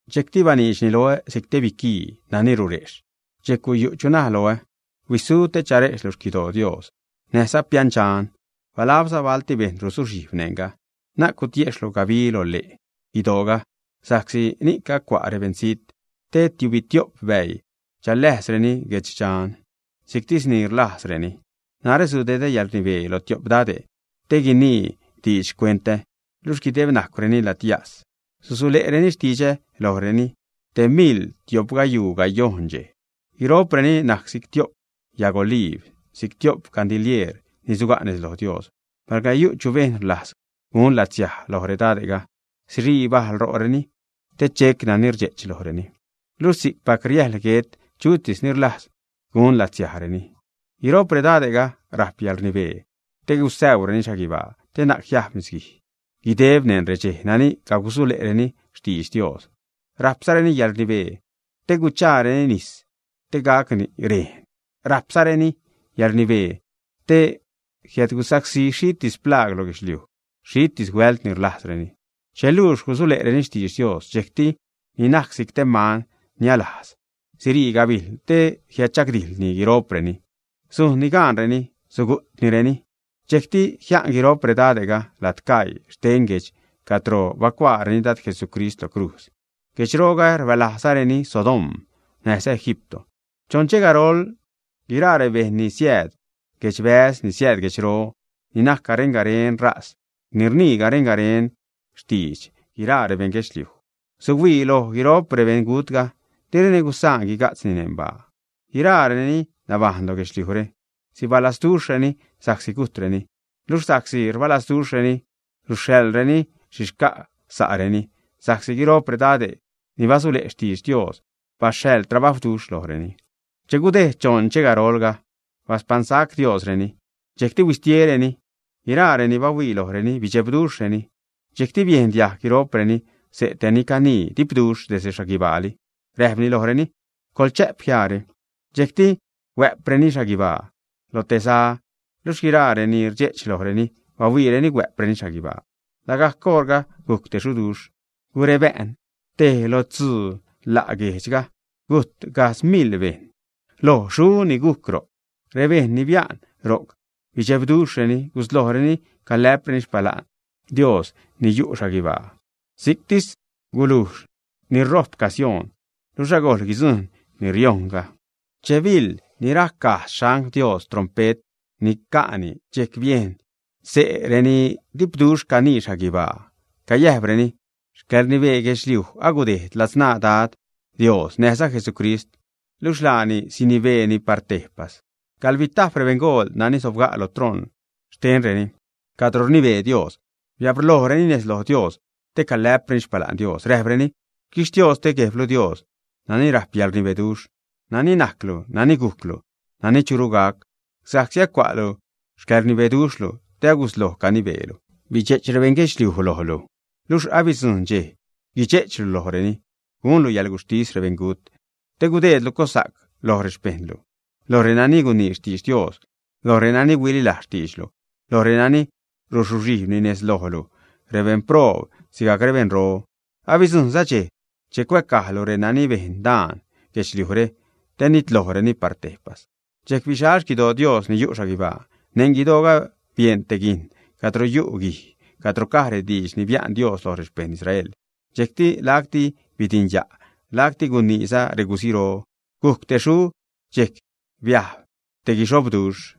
Dxejcti baniidxni loä si'c te biquii nani rurejxh. Dxejc guyu' chu naj loä: ―Huisu te charejxhlu xquidoo Dios, näjza piändxan, balabza balti bejṉ rusuxhijb neṉga. Na'c gutiexhlu gabi lole' guidooga, sa'csi ni'c acua' rebeṉzijtni te tiubitio'p bäii chaläjsreni guedxdxan si'ctis ni rlajzreni. Narä sudedä yäḻrnibee lo tio'p dade' ni guinii diidx xcuentä, luxh guideb najcwreni ladyas, susule'reni xtidxä lojreni te miḻ tio'pgayuu gayojṉ dxej. Guiro'preni najc si'c tio'p yag oliib, si'c tio'p gandilieer ni suga' nez lo Dios. Palga yu' chu bejṉ rlajz gun latsiaj loj redade'ga, sirii bajl ro'reni te chec nani rdxe'ch lojreni. Luxh si'cpac riäjḻ guet chutis ni rlajz gun latsiajreni. Guiro'p redade'ga rajp yäḻrnibee te gusäureni xhaguibaa te na'c jiajb nisguij guideb neṉ redxej nani cagusule'reni xtidx Dios, rajpzareni yäḻrnibee te guchaareni nis te gacni rejn, rajpzareni yäḻrnibee te jiädgusacsí xhitis plaag lo guedxliuj, si'ctis huält ni rlajzreni. Che luux gusule'reni xtidx Dios, dxejcti ni najc si'c te man nialajz sirii gabijl te jiädchagdijḻni guiro'preni. Sujnni gaanreni, sugu'tnireni. Dxejcti jia'n guiro'p rebeṉgutga lad caii xten guejdx cadro bacuaareni Dad Jesucrist lo crujz. Guejdxroga rbälajzareni Sodoma näjza Egipto. Choṉ dxej garol guiraa rebejṉ ni siääd guedxbäz, ni siääd guedxro, ni najc garen-garen ṟaz, ni rnii garen-garen xtidx guiraa rebejṉ guedxliuj, suhuii loj guiro'p rebeṉgutga, direni gusaan guiga'tzreni neṉ baa. Guiraa renani nabajṉ lo guedxliujre sibalazduxhreni sa'csi gujtreni. Luxh sa'csi rbalajzduxhreni, suxhaḻzareni xhi xca' sa'reni; sa'csi guiro'p redade' ni basule' xtidx Dios baxhaḻ trabajwduxh lojreni. Che gudejd choṉ dxej garolga, baspaṉsac Diosreni, dxejcti huitiesacreni. Guiraa reni bahuii lojreni, bidxebduxhreni. Dxejcti biejn diajg guiro'preni xse' te ni canii dipduxh desde xhaguibaali, räjpni lojreni: ―Coḻchä'p jiaare. Dxejcti huä'preni xhaguibaa lo te za, luxh guiraa renani rdxe'ch lojreni, bahuiireni huä'preni xhaguibaa. Lagajc oṟga gujc te xuduxh, gurebä'n tej lo tzuu la' guejdxga, gujt gajdz miḻ bejṉ lo xu ni gujc ro'c. Rebejṉ ni bia'n ro'c bidxebduxhreni, guslojreni calä'preni xpala'n Dios ni yu' xhaguibaa. Si'cti gulujx ni rojp casioon, luxh agojl guidzujṉ ni riojṉga. Che biḻ ni rajc gajdz xangl Dios trompe't ni ca'ni, dxejc biejn xse' reni dipduxh canii xhaguibaa, cayäjpreni: Xcäḻrnibee guedxliuj agudejd ladzṉaa Dad Dios näjza Jesucrist; luxh laani sinibeeni par tejpas. Gaḻbitajp rebeṉgool nani sobga' lo troṉ xtenreni cadro rnibee Dios, biabrlojreni nez loj Dios te calä'preni xpala'n Dios. Räjpreni: Xquixtioste Guejblu Dios, nani rajp yäḻrnibeduxh, nani najclu, nani gujclu, nani churu gac, sa'csi acua'lu xcäḻrnibeduxhlu te agusloj canibeelu. Bidxe'ch rebeṉ guedxliuj lojlu, luxh abidzujṉ dxej guidxe'chlu lojreni, gunlu yäḻguxhtis rebeṉgut, te gudeedlu cossa'c loj rexpejṉlu, lo renani gunii xtidx Dios, lo renani huililajz xtiidxlu, lo renani rusuxhijbni nez lojlu; rebeṉproob sigajc rebeṉro. Abidzujṉza dxej che cuäcajlu renani bejn daan guedxliujre, te nitlojreni par tejpas. Dxejc bixal xquidoo Dios ni yu' xhaguibaa, neṉ guidooga bieṉ te guijn cadro yu' guij cadro caj rediidx ni bia'n Dios loj rexpejṉ Israel. Dxejcti lacti bidinya', lacti guiniiza reguziro, gujc te xu, dxejc biajb te guixobroduxh.